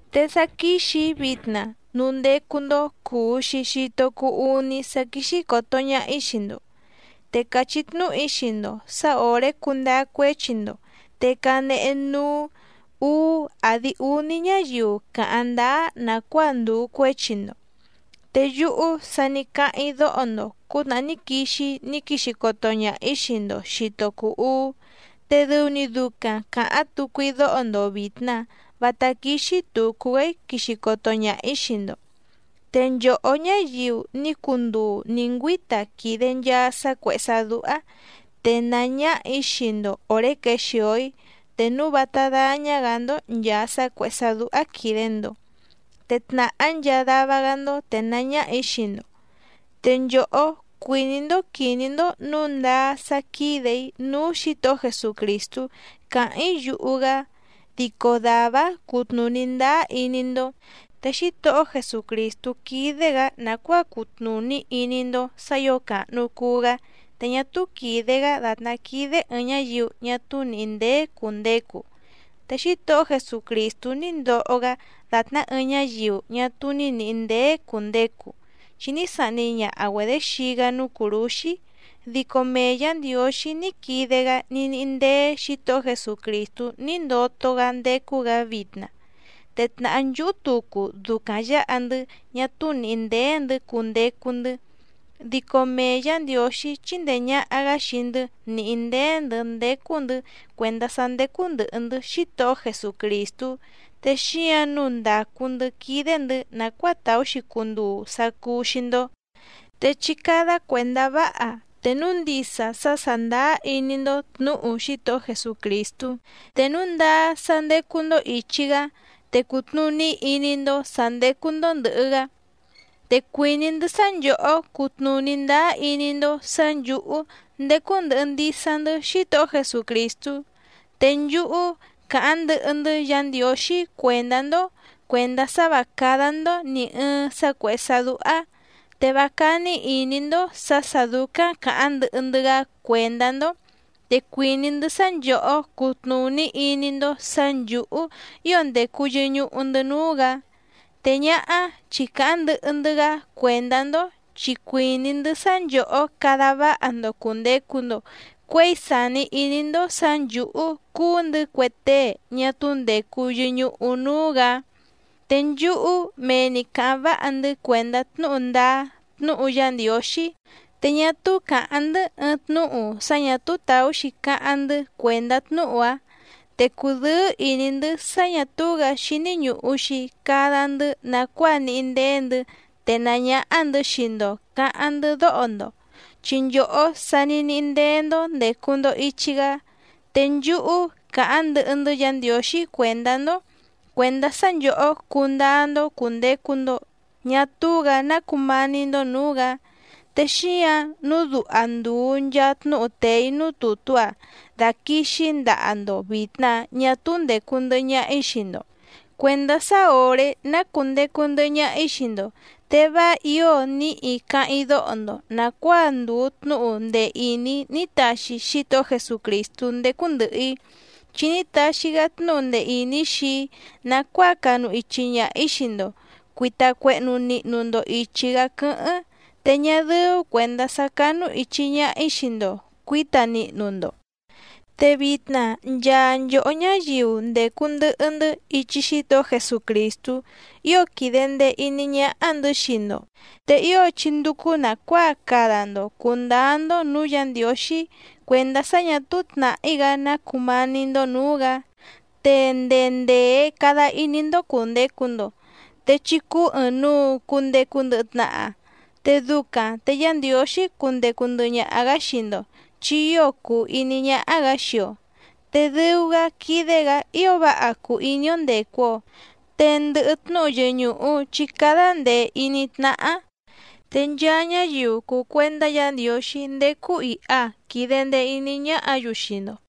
Te sá quíxì‑í vitna núú ndécú‑ndó cùu‑xi xito cuu úní sá quíxí còto ñaha‑í xii‑ndo. Te càchí tnúhu‑í xii‑ndo sǎ òré cundáá cuéchi‑ndo te canehe núú ǔú àdi úní ñáyiu cáháⁿ ndáá nàcuáa ndùu cuéchi‑ndo. Te yúhú sa ní cáháⁿ‑í dóho‑ndo cǔtnàhá ní quixi‑í ní quixi coto ñaha‑ǐ xii‑ndo xìto cuu úú, te dɨu‑ni ducaⁿ càháⁿ tucu‑í dóho‑ndo vìtna vátá quíxí tùcu‑gá‑í quixi coto ñaha‑ǐ xii‑ndo. Te nchòhó ñáyiu ní cunduu nǐ ngüíta quìde nchaa sá cuèhé sá dúhá, tenàá ñáhà‑í xii‑ndo òré quexìo‑í te núu vátá dáñá‑gǎ‑ndó nchàa sá cuèhé sá dúhá quìde‑ndo te tnàhá nchaa dava‑gá‑ndó tènaá ñáhà‑í xii‑ndo. Te nchòhó cuìní‑ndó quìní‑ndó nǔu ndáá sá quídè‑í núú Xǐtohó Jesucrìstú càháⁿ‑í yuhu‑gá, dico dàvá‑áⁿ cutnùní ndáá iní‑ndó. Te Xítohó Jesucrìstú quídé‑gǎ nàcuáa cutnùní iní‑ndó sǎ ǐo càhnu cuu‑gá te ñá túú quìde‑gá dàtná quídé ɨ̀ɨⁿ ñáyiu ñá túú nìhí ndéé cùndecu. Te Xítohó Jesucrìstú ní ndoho‑gá dàtná ɨɨⁿ ñáyiu ñá túú nìhí ndéé cùndecu, chi ní sahni ñaha‑güedě xii‑gá núú cùrúxí dico mee Yǎ Ndiǒxí ní quide‑gá ní níhí ndéé Xǐtohó Jesucrìstú ní ndoto‑gá ndécú‑gǎ vitna, te tnàhá nchúhú tucu ducaⁿ yǎha‑ndɨ́ ñá túú nìhí ndéé‑ndɨ̌ cundecu‑ndɨ́, dico mee Yǎ Ndiǒxí chíndèe ñaha‑gá xii‑ndɨ́ nìhí ndéé‑ndɨ̌ ndécú‑ndɨ̌ cuèndá sá ndécú ndɨ̀hɨ‑ndɨ́ Xítohó Jesucrìstú, te xíǎⁿ nǔu ndàcu‑ndɨ́ quídé‑ndɨ̌ nàcuáa tàú‑xi cunduu sá cúú‑xí‑ndó. Te chí cádá cuèndá váha te núu ndisa sá sàndáá iní‑ndó tnǔhu Xítohó Jesucrìstú, te núu ndáá sá ndécú‑ndó ìchi‑gá te cùtnuní iní‑ndó sǎ ndécú‑ndó ndɨ̀hɨ‑gá. Te cuìní‑ndɨ́ sá nchòhó cutnùní ndáá iní‑ndó sǎ nchǔhú ndécú ndɨ̀hɨ ndisa‑ndɨ́ Xítohó Jesucrìstú. Te nchúhú càháⁿ ndɨhɨ‑ndɨ́ Yǎ Ndiǒxí cuèndá‑ndó cuèndá sá vǎ cádá‑ndó nì ɨɨⁿ sá cuèhé sá dúhá, te vá cání ìní‑ndó sǎ sà dúcáⁿ càháⁿ ndɨhɨ‑ndɨ́‑gá cuèndá‑ndó, te cuìní‑ndɨ́ sá nchòhó cutnùní iní‑ndó sǎ nchǔhú ío ndècu yɨñuhu‑ndɨ́ núú‑gǎ, te ñáhá chi càháⁿ ndɨhɨ‑ndɨ́‑gá cuèndá‑ndó chi cuìní‑ndɨ́ sá nchòhó cada váha‑ndo cùndecu‑ndo cuéi sàni iní‑ndó sǎ nchǔhú cúú‑ndɨ̌ cue tée ñá túú ndècu yɨñuhu núú‑gǎ. Te nchúhú mee‑ni càháⁿ váha‑ndɨ́ cuèndá tnúhu ndáá tnúhu Yá Ndiǒxí, te ñá túú càháⁿ‑ndɨ́ ɨɨⁿ tnúhu sá ñà túú tàú‑xi cáháⁿ‑ndɨ́ cuèndá tnúhu‑áⁿ. Te cùdɨ́ɨ́ ìní‑ndɨ́ sá ñà túú‑gǎ xíní ñùhu‑xi cada‑ndɨ́ nàcuáa níhí ndéé‑ndɨ̌ tenàá ñáhá‑ndɨ̌ xii‑ndo cǎháⁿ‑ndɨ́ dóho‑ndo, chi nchòhó sa ní níhí ndéé‑ndó ndècu‑ndo ichi‑gá. Te nchúhú càháⁿ ndɨhɨ‑ndɨ́ Yǎ Ndiǒxí cuèndá‑ndó cuèndá sá nchòhó cundáá‑ndó cùndecu‑ndo ñá túú‑gǎ ná cumání‑ndó nǔú‑gǎ. Te xíǎⁿ nǔu duha ndùu nchaa tnúhu tèe‑í núú tùtú‑a daquìxi‑í ndaha‑ndo vìtna ñá túú ndècu ndɨhɨ ñaha‑í xii‑ndo, cuèndá sá òré ná cùndecu ndɨhɨ ñaha‑í xii‑ndo te vá ǐo níhi cáháⁿ‑í dóho‑ndo nàcuáa ndùu tnúhu ndee ìní ní taxi Xítohó Jesucrìstú ndécú ndɨ̀hɨ‑í, chi ní taxi‑gá tnúhu ndee ìní xii‑í nàcuáa canu ichi ñaha‑ǐ xii‑ndo cuìta cuehnu nihnu‑ndo ichi‑gá quɨ́hɨ́ⁿ, te ñá dɨ́ú cuèndá sá cánúìchi ñaha‑í xii‑ndo cuǐta nihnu‑ndo. Te vitna nchaa nchòhó ñáyiu ndècu ndɨhɨ‑ndɨ́ ichi Xítohó Jesucrìstú ío quìde ndee iní ñáhá‑ndɨ̌ xii‑ndo, te ío chí ndúcú nàcuáa cada‑ndo cùndáá‑ndó nǔú Yǎ Ndiǒxí cuèndá sá ñà túú tnàhí‑gá ná cùmání‑ndó nǔú‑gǎ, te ndee ndèe cada iní‑ndó cùndecu‑ndo, te chí cúú ɨ̀ɨⁿnuu cundecu ndɨhɨ tnaha, te ducaⁿ te Yá Ndiǒxí cundecu ndɨhɨ ñaha‑gǎ xii‑ndo chi ío cùu iní ñáhá‑gǎ xii‑o, te dɨu‑gá quídé‑gǎ ío váha cùu iní‑ó ndècu‑o. Te ndɨhɨ tnúhu yɨñùhu chí cádá ndèe iní tnáhá. Te nchaa ñáyiu cùu cuendá Yǎ Ndiǒxí ndécú ìha quide ndee iní ñáhǎ‑yu xii‑ndo.